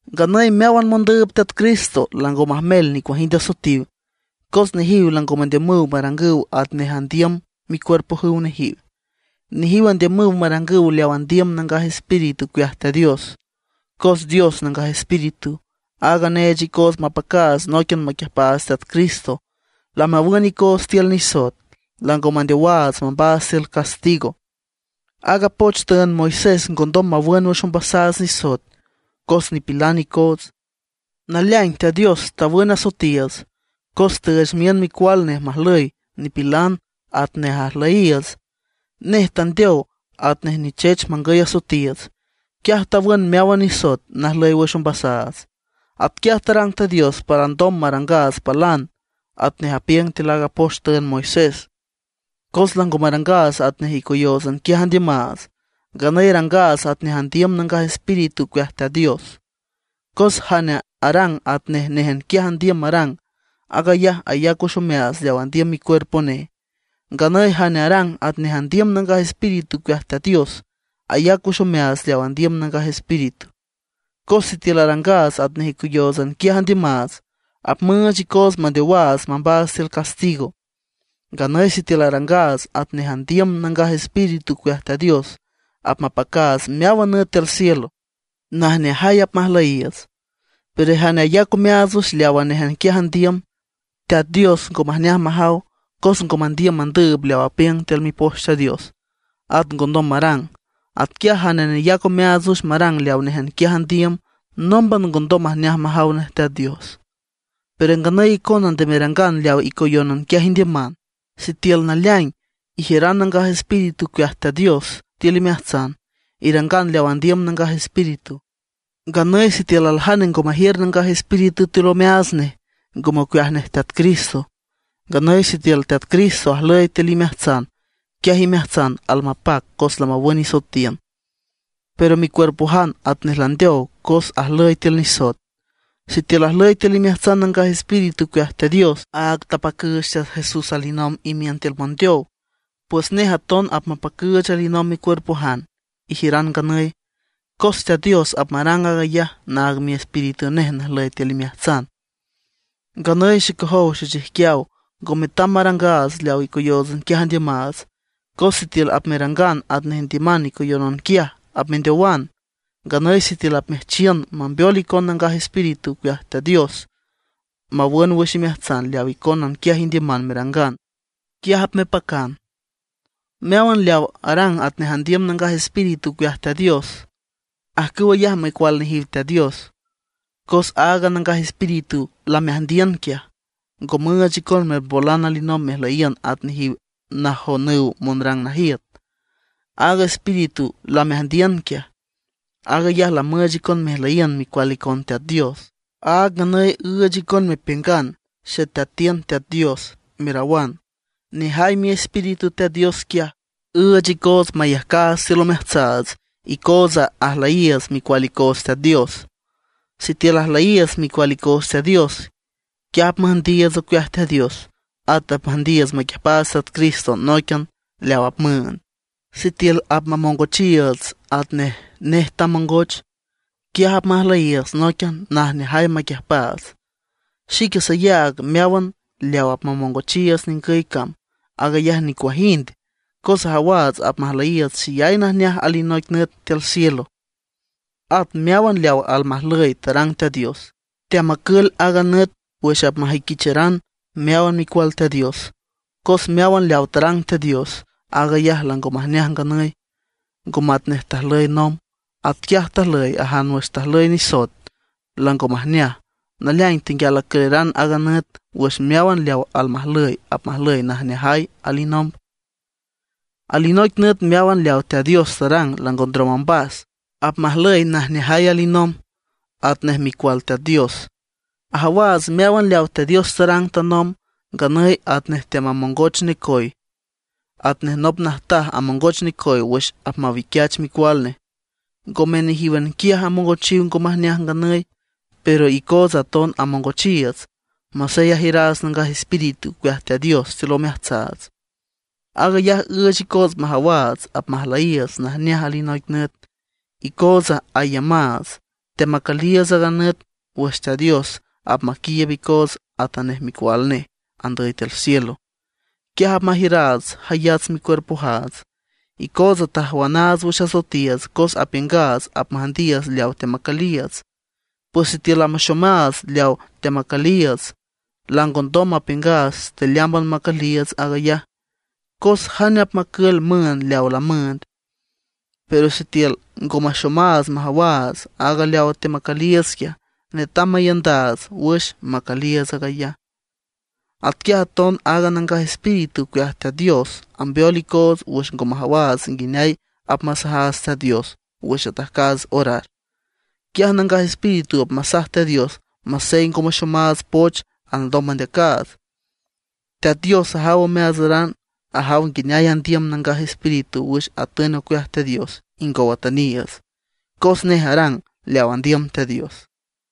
Nganüy meáwan mondüüb Teat Cristo lango majmel nicuajind asoetiw. Cos nejiw lango mandiümüw marangüw atnej andiüm micuerpojüw nejiw; nejiw andiümüw marangüw leaw andiüm Nangaj Espíritu ocueaj Teat Dios. Cos Dios Nangaj Espíritu, aaga neech icoots mapacaats nóiquian maquiüjpaats Teat Cristo, lamawün icoots tiül nisoet; lango mandeowaats mambaats tiül castigo. Aaga poch tüünd Moisés ngondom mawün wüx ombasaats nisoet, cos nipilan icoots. Naleaing Teat Dios tawün asoetiiüts cos tüüch miün micual nej majlüy nipilan atnej ajlüyiiüts. Nej tandeow atnej nichech mangüy asoetiiüts. Quiaj tawün meáwan nisoet najlüy wüx ombasaats. Atquiaj tarang Teat Dios para alndom marangaats palan atnej apiüng tiül aaga poch tüünd Moisés, cos lango marangaats atnej icoyóotsan quiaj andiümaats; nganüy arangaats atnej andiüm Nangaj Espíritu ocueaj Teat Dios. Cos jane arang atnej néjan quiaj andiüm marang, aag ayaj ayac wüx omeaats leaw andiüm micuerpo nej. Nganüy jane arang atnej andiüm Nangaj Espíritu ocueaj Teat Dios, ayac wüx omeaats leaw andiüm Nangaj Espíritu. Cos sitiül arangaats atnej icoyóotsan quiaj andiümaats, apmüüch icoots mandeowaats mambaats tiül castigo. Nganüy sitiül arangaats atnej andiüm Nangaj Espíritu ocueaj Teat Dios, apmapacaats meáwan nüt tiül cielo, najneajay apmajlüyiiüts. Pero jane ayac omeaats wüx leawa néjan quiaj andiüm, Teat Dios ngo majneaj majaw, cos ngo mandiüm mandüüb leaw apiüng tiül Mipoch Teat Dios, at ngondom marang. Atquiaj jane neyac omeaats wüx marang leaw néjan quiaj andiüm, nómban ngondom majneaj majaw nej Teat Dios. Pero nganüy icona nde merangan leaw icoyónan quiaj indiüman. Sitiül naleaing ijiüran Nangaj Espíritu ocueaj Teat Dios tiül imeajtsan, irangan leaw andiüm Nangaj Espíritu. Nganüy sitiül aljane ngo majiür Nangaj Espíritu tiül omeaats nej, ngome ocueaj nej Teat Cristo. Nganüy sitiül Teat Cristo ajlüy tiül imeajtsan quiaj imeajtsan almapac cos lamawün isoetiün; pero micuerpojan atnej landeow cos ajlüy tiül nisoet. Sitiül ajlüy tiül imeajtsan Nangaj Espíritu ocueaj Teat Dios, áag tapacüüch Teat Jesús alinomb imiün tiül mondeow; pues nej aton apmapacüüch alinomb micuerpojan ijiüran nganüy. Cos Teat Dios apmarang aag ayaj naag Miespíritu nej najlüy tiül imeajtsan. Nganüy xecojow xechijquiaw, ngo metam marangaats leaw icoyóotsan quiaj andiümaats. Cos sitiül apmerangan atnej indiüman icoyónan quiaj, apmendeowan. Nganüy sitiül apmeajchiün mambeol icon Nangaj Espíritu ocueaj Teat Dios mawün wüx imeajtsan leaw icónan quiaj indiüman merangan, quiaj apmepacan. Meáwan leaw arang atnej andiüm Nangaj Espíritu ocueaj Teat Dios, ajcüw ayaj micual nejiw Teat Dios. Cos aaga Nangaj Espíritu lameajndiün quiaj, ngo müüch icon mermbolan alinomb mejlüyiün at nejiw najonüw monrang najiüt. Aaga Espíritu lameajndiün quiaj, aag ayaj lamüüch icon mejlüyiün micual icon Teat Dios. Áag nganüy üüch icon mepiüngan: “¡Xeteatiün Teat Dios!”, merawan. Nejay Miespíritu Teat Dios quiaj, üüch icoots mayajcaats tiül omeajtsaats icootsa ajlüyiiüts micual icoots Teat Dios. Sitiül ajlüyiiüts micual icoots Teat Dios, quiaj apmüjndiiüts ocueaj Teat Dios. At apmüjndiiüts maquiüjpaats Teat Cristo nóiquian leaw apmüünd. Sitiül apmamongochiiüts atnej nej tamongoch, quiaj apmajlüyiiüts nóiquian najneajay maquiüjpaats. Xique sayaag meáwan leaw apmamongochiiüts ningüy cam, aag ayaj nicuajind, cos ajawaats apmajlüyiiüts xeyay najneaj alinoic nüt tiül cielo. At meáwan leaw almajlüy tarang Teat Dios, teamacül aaga nüt wüx apmajüiquicharan meáwan micual Teat Dios. Cos meáwan leaw tarang Teat Dios, aag ayaj lango majneaj nganüy, ngo matnej tajlüy nomb. Atquiaj ajlüy ajan wüx tajlüy nisoet, lango majneaj. Naleaing tenguial acüleran aaga nüt wüx meáwan leaw almajlüy apmajlüy najneajay alinomb. Alinoic nüt meáwan leaw Teat Dios tarang lango ndrom ombas, apmajlüy najneajay alinomb, atnej micual Teat Dios. Ajawaats meáwan leaw Teat Dios tarang tanomb, nganüy atnej teamamongoch necoy, atnej nop najtaj amongoch necoy wüx apmawiquiach micual nej. Ngome nejíwan quiaj amongochiw ngo majneaj nganüy, pero icootsa aton amongochiiüts, masey ajiüraats Nangaj Espíritu ocueaj Teat Dios tiül omeajtsaats. Aag ayaj üüch icoots majawaats apmajlüyiiüts najneaj alinoic nüt. Icootsa aiümaats, teamacüliiüts aaga nüt wüx Teat Dios apmaquiiüb icoots atanej micual nej, andüy tiül cielo. Quiaj apmajiüraats jayats micuerpojaats. Icootsa tajwanaats wüx asoetiiüts cos apiüngaats apmüjndiiüts leawa teamacüliiüts. Pues sitiül lamaxomaats leawa teamacüliiüts, langondom mapiüngaats tealeámban macüliiüts aag ayaj. ¿Cos jane apmacül müünd leawa lamüünd? Pero sitiül ngo maxomaats majawaats aaga leawa teamacüliiüts quiaj, netam maiündaats wüx macüliiüts aag ayaj. Atquiaj aton aaga Nangaj Espíritu ocueaj Teat Dios ambeol icoots wüx ngo majawaats nguineay apmasajaats Teat Dios wüx atajcaats orar. Quiaj Nangaj Espíritu apmasaj Teat Dios masey ngo maxomaats poch alndom mandeacaats. Teat Dios ajaw omeaatsaran, ajaw nguineay andiüm Nangaj Espíritu wüx atün ocueaj Teat Dios ingow atüniiüts, cos nej arang leaw andiüm Teat Dios.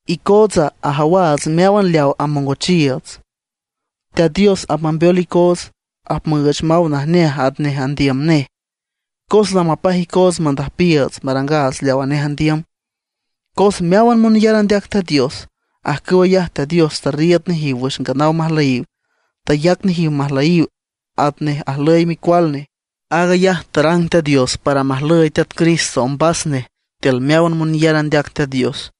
Icootsa ajawaats meáwan leaw amongochiiüts, Teat Dios apmambeol icoots, apmüüch maw najneaj atnej andiüm nej, cos lamapaj icoots mandüjpiiüts, marangaats leawa nej andiüm. Cos meáwan monyar andeac Teat Dios, ajcüw ayaj Teat Dios tarriiüd nejiw wüx nganaw majlüyiw; tayac nejiw majlüyiw atnej ajlüy Micual nej. Aag ayaj tarang Teat Dios para majlüy Teat Cristo ombas nej tiül meáwan monyar andeac Teat Dios.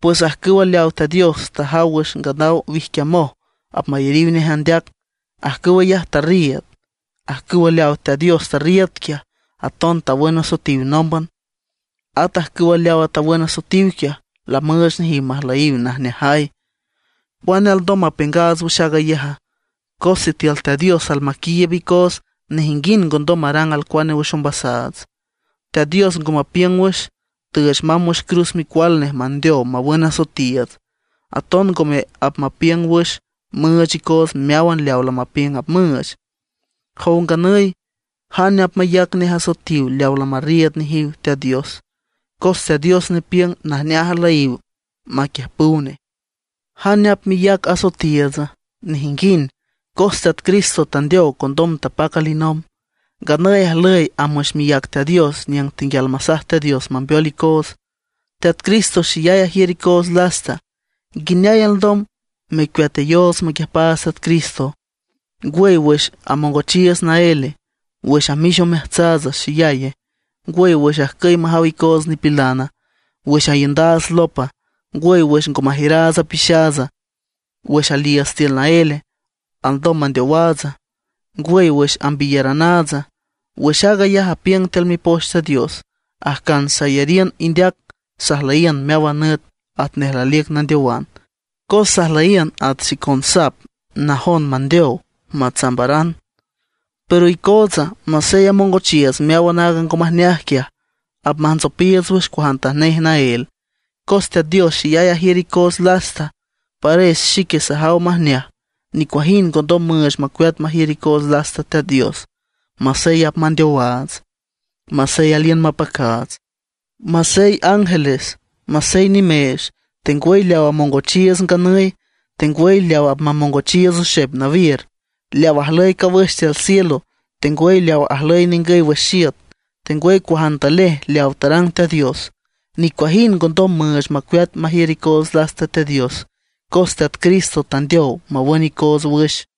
Pues ajcüw leawa Teat Dios tajaw wüx nganaw wijquiamoj apmayariw nej andeac, ajcüw ayaj tarriiüd. Ajcüw leawa Teat Dios tarriiüd quiaj, aton tawün asoetiw nómban. At ajcüw leawa tawün asoetiw quiaj, lamüüch nejiw majlüyiw najneajay. ¿Cuane alndom mapiüngaats wüx aag ayaja? Cos sitiül Teat Dios almaquiiüb icoots, nejinguind ngondom marang alcuane wüx ombasaats. Teat Dios ngo mapiüng wüx, tüüch mamb wüx cruz micual nej mandeow mawün asoetiiüts; aton ngome apmapiüng wüx müüch icoots meáwan leawa lamapiüng apmüüch. Jow nganüy ¿jane apmayac nej asoetiw leaw lamarriiüd nejiw Teat Dios? Cos Teat Dios nepiüng najneaj ajlüyiw maquiüjpüw nej. ¿Jane apmeyac asoetiiütsa? Nejinguind, cos Teat Cristo tandeow condom tapac alinomb; nganüy ajlüy amb wüx miác Teat Dios niüng tenguial masaj Teat Dios mambeol icoots. Teat Cristo xeyay ajiür icoots lasta. ¿Nguineay alndom mecueateyoots maquiüjpaats Teat Cristo? ¿Ngwüy, wüx amongochiiüts naéle? ¿Wüx amix omeajtsaatsa xeyaye? ¿Ngwüy, wüx ajcüy majaw icoots nipilana? ¿Wüx aiündaats lopa? ¿Ngwüy, wüx ngo majiüraats apixaatsa? ¿Wüx aliiüts tiül naéle, alndom mandeowaatsa? ¿Ngwüy, wüx ambiyaranaatsa? Wüx aag ayaj apiüng tiül Mipoch Teat Dios: Ajcan sayariün indeac, sajlüyiün meáwan nüt atnej laliüc nandeowan; cos sajlüyiün at xicon sap najon mandeow, matsambaran. Pero icootsa, masey amongochiiüts meáwan aaga ngo majneaj quiaj, apmajntsopiiüts wüx cuajantanej naél, cos Teat Dios xeyay ajiür icoots lasta. Pares xique sajaw majneaj, nicuajind ngondom müüch macueat majiür icoots lasta Teat Dios. Masey apmandeowaats, masey aliün mapacaats; ata ángeles, nimeech, tengwüy leaw amongochiiüts nganüy, tengwüy leaw apmamongochiiüts oxep nawiür, leaw ajlüy cawüx tiül cielo, tengwüy leaw ajlüy ningüy wüx iüt, tengwüy cuajantanej leaw tarang Teat Dios; nicuajind ngondom müüch macueat majiür icoots lasta Teat Dios cos Teat Cristo tandeow mawün icoots wüx.